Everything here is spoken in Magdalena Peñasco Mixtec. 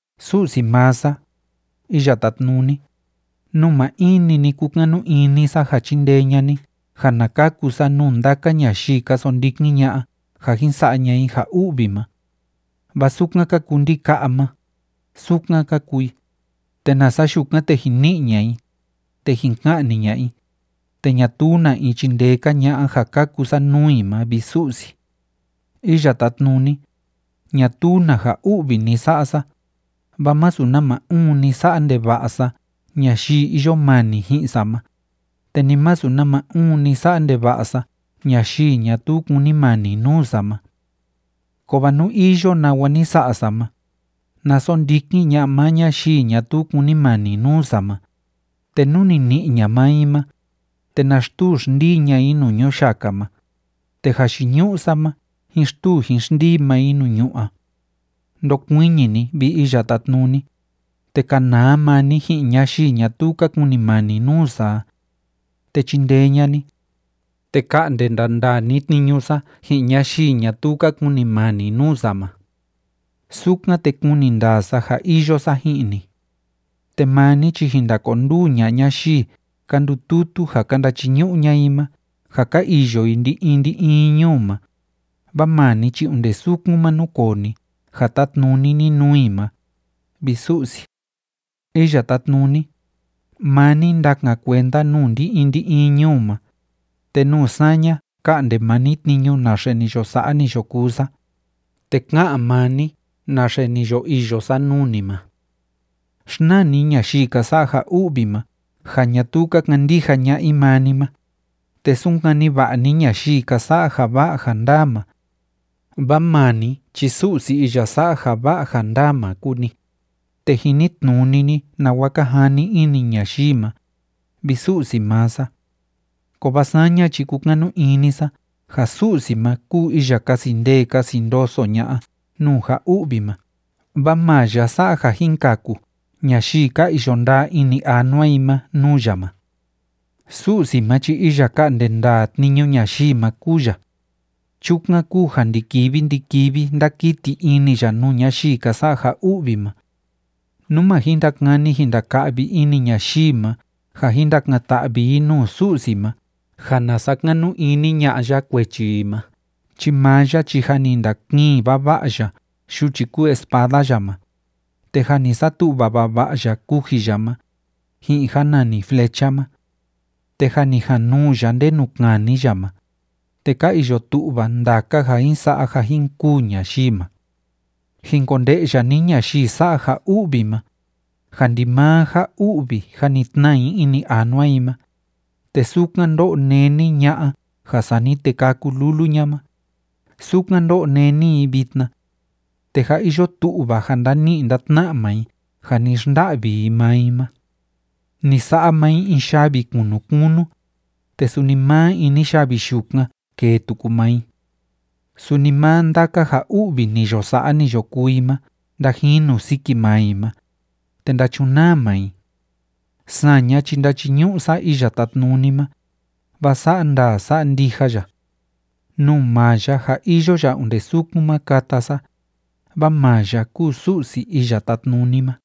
Su'si maa sa, Iya Tátnuni, nuu maa in‑ni ni kúkanu ini sa ja chindee ña'a ni ja na kaku sa nuu ndaka ñayii ka sondikin ña'a ja jin sa'a ña'a i ja u'vi ma. Vaa sukan ka kuu ndika'a ma, sukan ka kuu i, te nasa yukan, te jin ni'i ña'a i, te jin ka'ni ña'a i, te ñatuu na in chindee‑ka ña'a ja kaku sa nuu i ma, vi Su'si. Iya Tátnuni, ñatuu na ja u'vi ni sa'a sa, vaa masu nama uun ni sa'a ndeva'a sa ñayii iyo mani ji'in sa ma, te ni masu nama uun ni sa'a ndeva'a sa ñayii ñatuu kúnimani nuu sa ma. Kovaa nú iyo nawa ni sa'a sa ma, na sondikin ña'a maa ñayii ñatuu kúnimani nuu sa ma, te nú ni ni'i ña'a maa i ma, te na xtuu xndii ña'a i nuu ñuyaka ma, te jayiñu'u sa ma jín xtuu jín xndii maa i nuu ñu'ú a. Ndokuiñi ni, vi Iya Tátnuni, te kanaa maa ni ji'in ñayii ñatuu ka kunimani nuu sa a. Te chindee ña'a ni, te ka'nde ndandaa ni tniñu sa ji'in ñayii ñatuu ka kunimani nuu sa ma. Sukan, te kuni ndaa sa ja iyo sa ji'in ni. Te maa ni chi jin ndakonduu ña'a ñayii ka ndututu ja ka ndachiñu'u ña'a i ma ja ka iyo i ndi‑in ndi‑in ñuu ma, vaa maa ni chi onde sukun ma núkoo ni ja tátnuni ni nuu i ma, vi Su'si. Iya Tátnuni, maa ni ndakan kuenda nuu ndi‑in ndi‑in ñuu ma, te nuu saña ka'nde maa ni tniñu naxe ni yo sa'a, ni yo kuu sa, te ka'an maa ni naxe ni yo iyo sa nuu ni ma. Xnaa ni ñayii ka sa'a ja u'vi ma, ja ñatuu ka kandija ña'a i maa ni ma, te sunkani va'a ni ñayii ka sa'a ja va'a ja ndaa ma. Vaa maa ni chi Su'si iya sa'a ja va'a ja ndaa ma kúu ni, te jinitnuni ni nawa ka jani ini ñayii ma, vi Su'si maa sa. Kovaa saña chi kúkanu ini sa ja Su'si ma kúu iya kasi ndee kasi ndoso ña'a nuu ja u'vi ma, vaa maa ya sa'a ja jin kaku ñayii ka iyo ndaa ini anua i ma nuu ya ma. Su'si ma chi iya ka'nde ndaa tniñu ñayii ma kúu ya. Chukan kúu ja ndi‑kivi ndi‑kivi ndákiti ini ya nuu ñayii ka sa'a ja u'vi ma. Nú ma jin ndakani jin ndaka'vi ini ñayii ma ja jin ndakan‑ta'vi i nuu Su'si ma ja na sakanu ini ña'a ya kuechi i ma chi maa ya chi jâ ni ndakiin vava'a ya yuchi kúu espada ya ma, te jâ ni satu'va vava'a ya kuji ya ma, ji'in ja nani flecha ma. Te jâ ni januu ya ndenu kani ya ma, te ka iyo tu'va ndaka ja jin sa'a ja jin kûu ñayii ma. Jin konde'ya ni ñayii sa'a ja u'vi ma, ja ndimaa ja u'vi jâ ni tnaa i ini anua i ma, te sukan ndó'o néni ña'a ja sani te kâku lulu ña ma, sukan ndó'o néni i vitna. Te jâ iyo tu'va ja ndani'i ndatna'a maa i ja ni xnda'vi i maa i ma. Ni sa'a maa i in yavi kunu kunu, te suni maa ini yavi yukan kêe tuku maa i. Suni maa ndaka ja u'vi ni yo sa'a, ni yo kuu i ma ndajinu siki maa i ma, te ndachunaa maa i. Saña chi ndachiñu'u sa Iya Tátnuni ma, vaa sa'a ndaa sa'a ndija ya. Nuu maa ya ja iyo ya onde sukun ma kata sa, vaa maa ya kúu Su'si Iya Tátnuni ma.